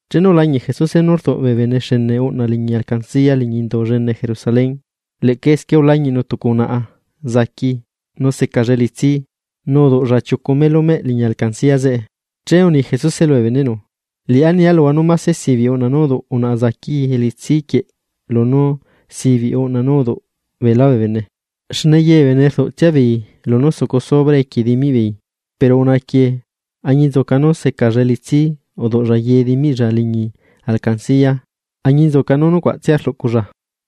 Chenu ulañiꞌ Jesuse nú rduꞌ bee bene xene uꞌna liñi alcancia liñi Indu llene Jerusalén, leꞌca esquie ulañiꞌnu tucu unaꞌa enu unguti niyuꞌ nu secalla elitsi, nu uduꞌlla chiucu melu nú meꞌ liñi alcancia zeꞌe. Che uni Jesuse lubee beneꞌnu: ―Liꞌá nia luhua nú máse sibiꞌ uꞌna nú uduꞌu unaꞌa zaqui elitsi quieꞌ lunú sibiꞌ uꞌna nú uduꞌu beelá bee bene. Xne ye bee bene rduꞌtsia beei lunú sucu sobra equie dimiꞌ beei, pero unaꞌa quieꞌ añinzuca nú secalla elitsi uduꞌlla ye dimiꞌlla liñi alcancia añinzuca nú nucuaꞌtsia rluꞌculla.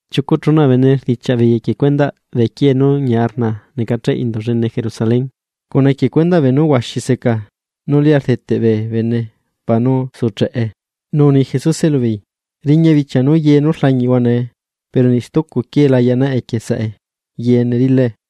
Chiucu chuna bee bene rdichiaꞌ beei equie cuendaꞌ bee quiee nú ñia rnaa necacheꞌ Indu llene Jerusalén, cuna equie cuendaꞌ beenu huaxi seca nú lia rdeteꞌ bee bene para nú sucheꞌe. Nu uni Jesuse lubeei: ―Riña bichia nú ye nú rlañiꞌhua nee, pero niꞌ stucu quiee la yaꞌnaꞌe equie saꞌe, yeene rilae.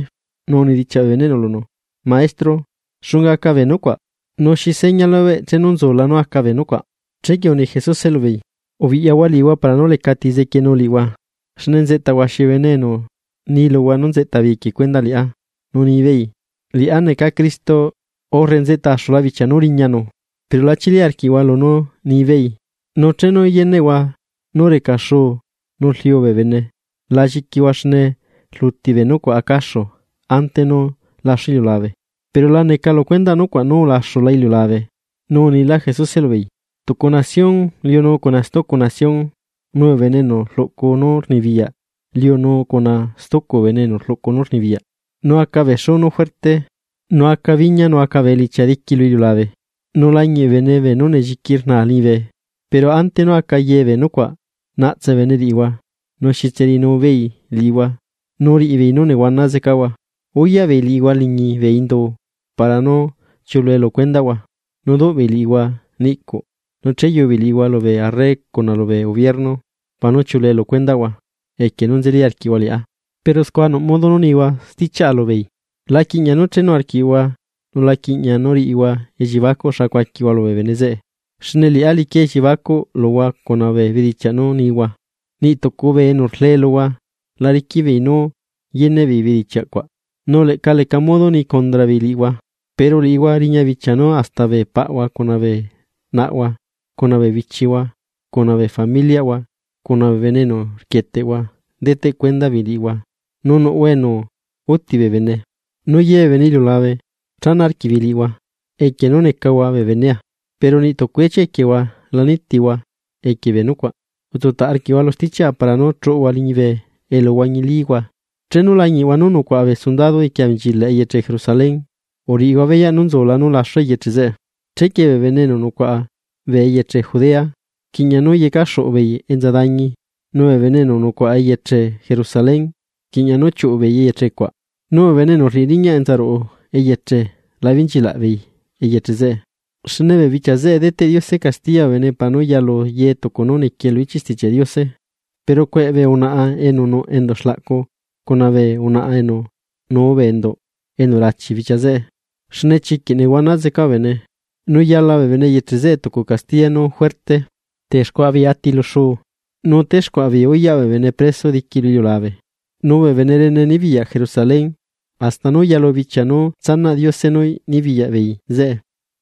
Nu unidichiaꞌ bee bene lunu: ―Maestro, ¿xunga aca bee nucuaꞌ? Nu ¿xi seña lubeꞌ nú nzula nú aca bee nucuaꞌ? Chequie uni Jesuse lubeei: ―Ubiꞌyahua liꞌihua para nú lecati zequienu liꞌihua. Xne nzeꞌta huaxi bee bene enu ni luhua nú nzeꞌta beei equie cuendaꞌ liꞌá, nu ni beei: “Liꞌá neca Cristo”; urre “Nzeꞌta axula bichia nú riñanu.” Pero la chili arquiꞌhua lunú nibeei. Nu chenu yeneꞌhua nú reca xuu nu rliu bee bene, la lliquihua xne rluti bee nucuaꞌ acaxu ante nú laxu iliulabe, pero la neca lu cuendaꞌ nucuaꞌ nú ulaxu iliulabe. Nu unilá Jesuse lubeei: ―Tucu nación liunu cuna stucu nación, nu bee gobierno liunu cuna stucu gobierno. Nu aca bee xú nu juerte, nu aca biña, nu aca bee elichia diqui lu iliulabe, nu lañiꞌ bee bene beenú nelliqui rnaa liñibe. ’Pero ante nú aca ye bee nucuaꞌ, naꞌtse bee bene liꞌihua, nu xitse riꞌinu beei liꞌihua nu riꞌibeei nú nehuana zecahua, uyaꞌ beei liꞌihua liñi bee indu para nú chiuꞌulue lu cuendaꞌhua. Duꞌ beei liꞌihua niꞌcuꞌ nu cheyubeei liꞌihua lubee arre cuna lubee gobierno para nú chiuꞌulue lu cuendaꞌhua equie nú nzeli arquiꞌhua liꞌá. Pero scua nuꞌ modo nú nihua stichiaꞌa lubeei. La quiꞌña nú chenu arquiꞌhua, nu la quiꞌña riꞌihua elliebacuꞌ xa cuaquihua lubee bene zeꞌe, xne liꞌá liquia elliebacuꞌ luhua cuna bee bedichiaꞌ nú nihua. Niꞌ tucu bee enu rlee luhua la riquiꞌ beei nú yeneꞌ beei bedichiaꞌ cuaꞌ, nu leꞌca leca modo ni condra beei liꞌihua. Pero liꞌihua riña bichia nú hasta bee paꞌhua cuna bee naꞌhua cuna bee bichihua cuna bee familiꞌhua cuna bee bene enu rquieteꞌhua deteꞌ cuenda beei liꞌihua, nu nuꞌhua enu uti bee bene. Nu ye bee bene iliulabe chana arquiꞌbeei liꞌihua, equie nú necahua bee benea. Pero niꞌ tucu ichia equiehua la nitihua equie bee nucuaꞌ. Utsutaꞌ arquiꞌhua lu stichiaꞌa para nú chuꞌuhua liñibe elu huañilíhua. ’Chenu lañiꞌhua nú nucuaꞌa bee sundado diqui abenchilaꞌ eyeche Jerusalén, uriꞌihua beyaꞌ nú nzula nú laxu eyeche zeꞌe. Chequie bee bene enu nucuaꞌa bee eyeche Judea, rquiꞌña nú yecaxuꞌu beei enza dañi, nu bee bene enu nucuaꞌa eyeche Jerusalén, rquiꞌña nú chiuꞌu beei eyeche cuaꞌ, nu bee bene enu rriꞌi riñaꞌ enza ruꞌu eyeche la benchilaꞌ beei eyeche zeꞌe. Xne bee bichia zeꞌe deteꞌ Diose castiya bee bene para nú yalu ye tucu nú niquie lu ichiꞌ Stichiaꞌ Diose. ¡Pero cueꞌ bee unaꞌa enu nuꞌ enduꞌ xlaꞌcu cuna bee unaꞌa enu nuu bee endu enu rachi bichia zeꞌe! Xne chiquiꞌ nehuana zeca bee bene, nu yala bee bene eyeche zeꞌe tucu castiya nú juerte. Texcuaꞌa beei ati lu xuu, nu texcuaꞌa beei uyaꞌ bee bene preso diqui lu iliulabe, nu bee bene rene nibiyaꞌ Jerusalén, hasta nú yalu bichia nú tsanaꞌ Diose nú nibiyaꞌ beei zeꞌe.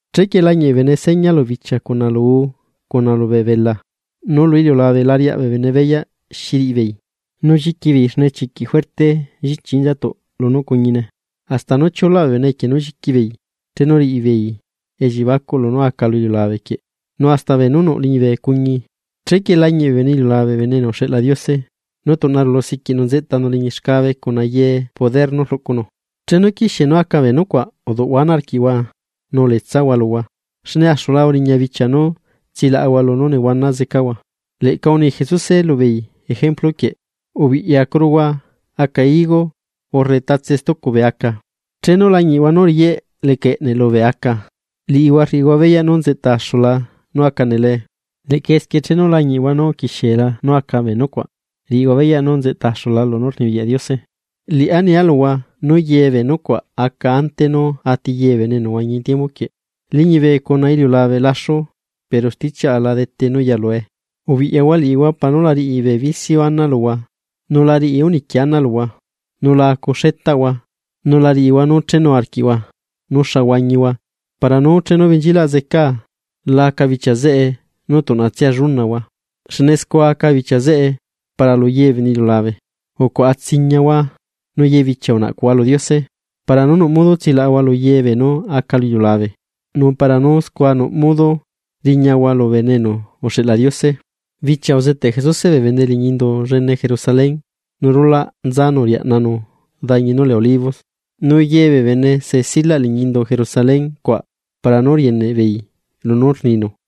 ’Chequie lañiꞌ bee bene seña lu bichia cuna lu uu cuna lubee belaa, nu lu iliulabe la riaꞌ bee bene beyaꞌ xi riꞌi beei, nu lliqui beei xne chiquiꞌ juerte llichi inzatuꞌ lunú cuñine. Hasta nú chiulaꞌ bee bene equie nú lliqui beei chenu riꞌi beei elliebacuꞌ lunú aca lu iliulabe quieꞌ, nu hasta beenú nuꞌ liñibe cuñi. Chequie lañiꞌ bee bene iliulabe Bene enu uxeꞌla Diose, nú tuꞌna rulu siquiꞌnu nzeꞌtanu liñi xcabe cuna ye nú rluꞌunu. Chenu quixie nú aca bee nucuaꞌ, uduꞌhua ana arquiꞌhua nu uletsahua luhua, xne axula uriña bichia nú tsilaꞌahua lunú nehuana zecahua. Leꞌca uni Jesuse lubeei ejemplu quieꞌ: ―Ubiꞌyacuruhua aca higo, urre tatse stucu bee aca. Chenu lañiꞌhua nú riyeꞌ leca eꞌneꞌ lubee aca, liꞌihua rriꞌihua beyaꞌ nú nzeꞌta axula nú aca nelee. Leꞌca esquie, chenu lañiꞌhua nú uquixiela nú aca bee nucuaꞌ, riꞌihua beyaꞌ nú nzeꞌta axula lunú rnibiyaꞌ Diose. ’Liꞌá nialuhua nú ye bee nucuaꞌ aca ante nú ati ye bee bene enu nehuañi tiembu quieꞌ. Liñibe cuna iliulabe laxu, pero stichiaꞌa la dete nú yalue. ’Ubiꞌyahua liꞌihua para nú la riꞌi bee bicio ana luhua nu la riꞌi úniqui ana luhua nu la acu xeꞌtahua nu la riꞌihua nú chenu arquiꞌhua nú xa huañihua para nú chenu benchilaꞌ zecaa, la aca bichia zeꞌe nu tuꞌnatsia llunahua. Xne scua aca bichia zeꞌe para lu ye bee bene iliulabe. Ucuaꞌa tsiñahua, nu ye bichia unaꞌcuꞌhua lu Diose para nú nuꞌ modo tsilaꞌahua lu ye beenú aca lu iliulabe, nu para nú scua nuꞌ modo riñahua lu Bene enu uxeꞌla Diose. Bichia uzeteꞌ Jesuse bee bene liñi indu llene Jerusalén, nu rulaꞌ nzanu riaꞌnanu dañi nú lee Olivos. Nu ye bee bene se silaꞌ liñi Indu Jerusalén cuaꞌ para nú rieneꞌ beei lunú rninu.